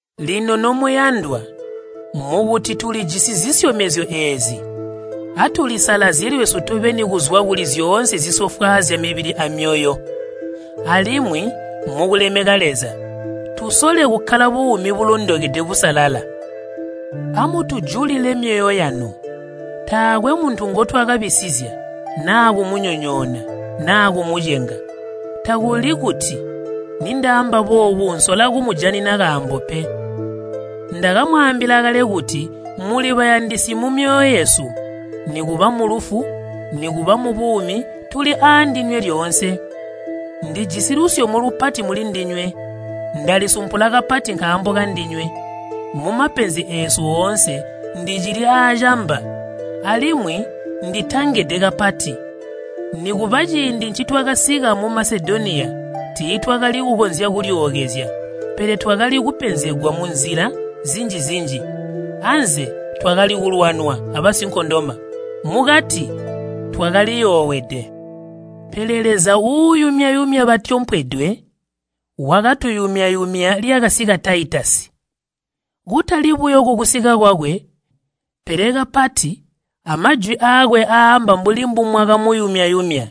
Lino nomuyandwa, mukuti tulijisi zisyomezyo eezi, atulisalazye lwesu tobeni kuzwa kuli zyoonse zisofwaazya mibili amyoyo. Alimwi mukulemeka Leza, tusole kukkala buumi bulondokede busalala. Amutujulile myoyo yanu. Taakwe muntu ngotwakabisizya, naa kumunyonyoona, naa kumucenga. Takuli kuti nindaamba boobu nsola kumujanina kaambo pe. Ndakamwaambila kale kuti muli bayandisi mumyoyo yesu, nikuba mulufu, nikuba mubuumi tuli aandinywe lyoonse. Ndijisi lusyomo lupati mulindinywe, ndalisumpula kapati nkaambo kandinywe. Mumapenzi eesu oonse ndicili aacamba, alimwi nditangede kapati. Nikuba ciindi ncitwakasika mu Masedoniya, tiitwakali kukonzya kulyookezya, pele twakali kupenzegwa munzila zinji-zinji. Anze twakali kulwanwa abasinkondoma, mukati twakaliyoowede. Pele Leza uuyumya-yumya batyompedwe wakatuyumya-yumya lyakasika Taitasi. Kutali buyo kukusika kwakwe, pele kapati amajwi aakwe aamba mbuli mbumwakamuyumya-yumya.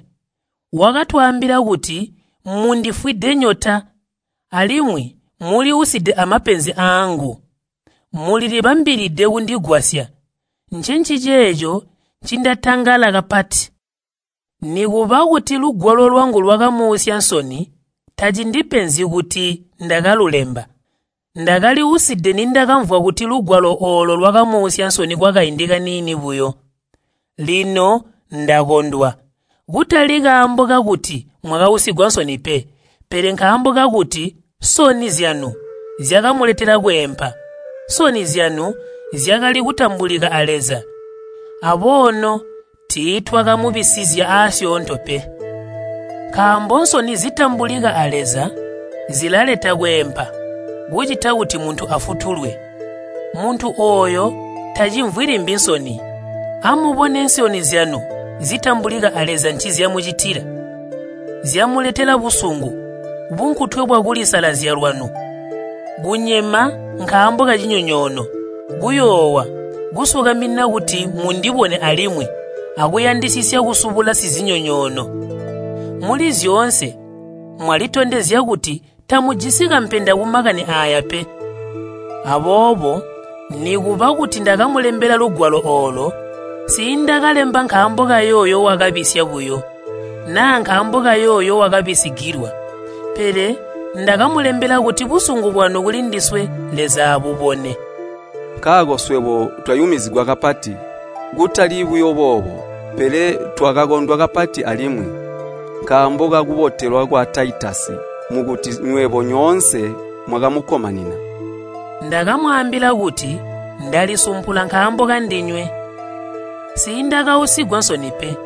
Wakatwaambila kuti mundifwide nyota, alimwi muli uside amapenzi aangu, mulilibambilide kundigwasya. Ncenciceeco ncindatangala kapati. Nikuba kuti lugwalo lwangu lwakamuusya nsoni tacindipenzyi kuti ndakalulemba. Ndakali uside nindakamvwa kuti lugwalo oolo lwakamuusya nsoni kwakaindi kaniini buyo. Lino ndakondwa, kutali kaambo kakuti mwakausigwa nsoni pe, pele nkaambo kakuti nsoni zyanu zyakamuletela kweempa. Nsoni zyanu zyakali kutambulika a Leza, aboono tiitwakamubisizya aasyoonto pe. Nkaambo nsoni zitambulika a Leza zilaleta kweempa kucita kuti muntu afutulwe. Muntu ooyo tacimvwi limbi nsoni. Amubone nsoni zyanu zitambulika a Leza ncizyamucitila. Zyamuletela busungu, bunkutwe bwakulisalazya lwanu, kunyema nkaambo kacinyonyoono, kuyoowa, kusukamina kuti mundibone alimwi akuyandisisya kusubula sizinyonyoono. Muli zyoonse mwalitondezya kuti tamujisi kampenda kumakani aaya pe. Aboobo nikuba kuti ndakamulembela lugwalo oolo, nsiindakalemba nkaambo kayooyo wakabisya buyo, naa nkaambo kayooyo wakabisigilwa, pele ndakamulembela kuti busungu bwanu kulindiswe Leza abubone. Nkaako swebo twayumizigwa kapati. Kutali buyo boobo, pele twakakondwa kapati alimwi, nkaambo kakubotelwa kwa Taitasi, mukuti nywebo nyoonse mwakamukkomanina. Ndakamwaambila kuti ndalisumpula nkaambo kandinywe. Nsiindakausigwa nsoni pe.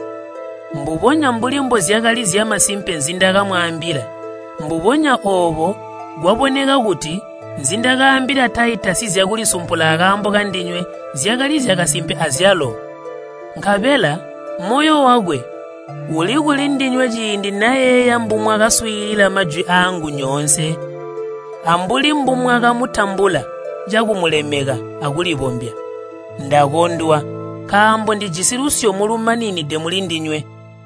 Mbubonya mbuli mbozyakali zyamasimpe nzindakamwaambila, mbubonya oobo kwaboneka kuti nzindakaambila Taitasi zyakulisumpula akaambo kandinywe zyakali zyakasimpe azyalo. Nkabela moyo wakwe uli kulindinywe ciindi nayeeya mbumwakaswiilila majwi aangu nyoonse, ambuli mbumwakamutambula cakumulemeka akulibombya. Ndakondwa, nkaambo ndijisi lusyomo lumaninide mulindinywe.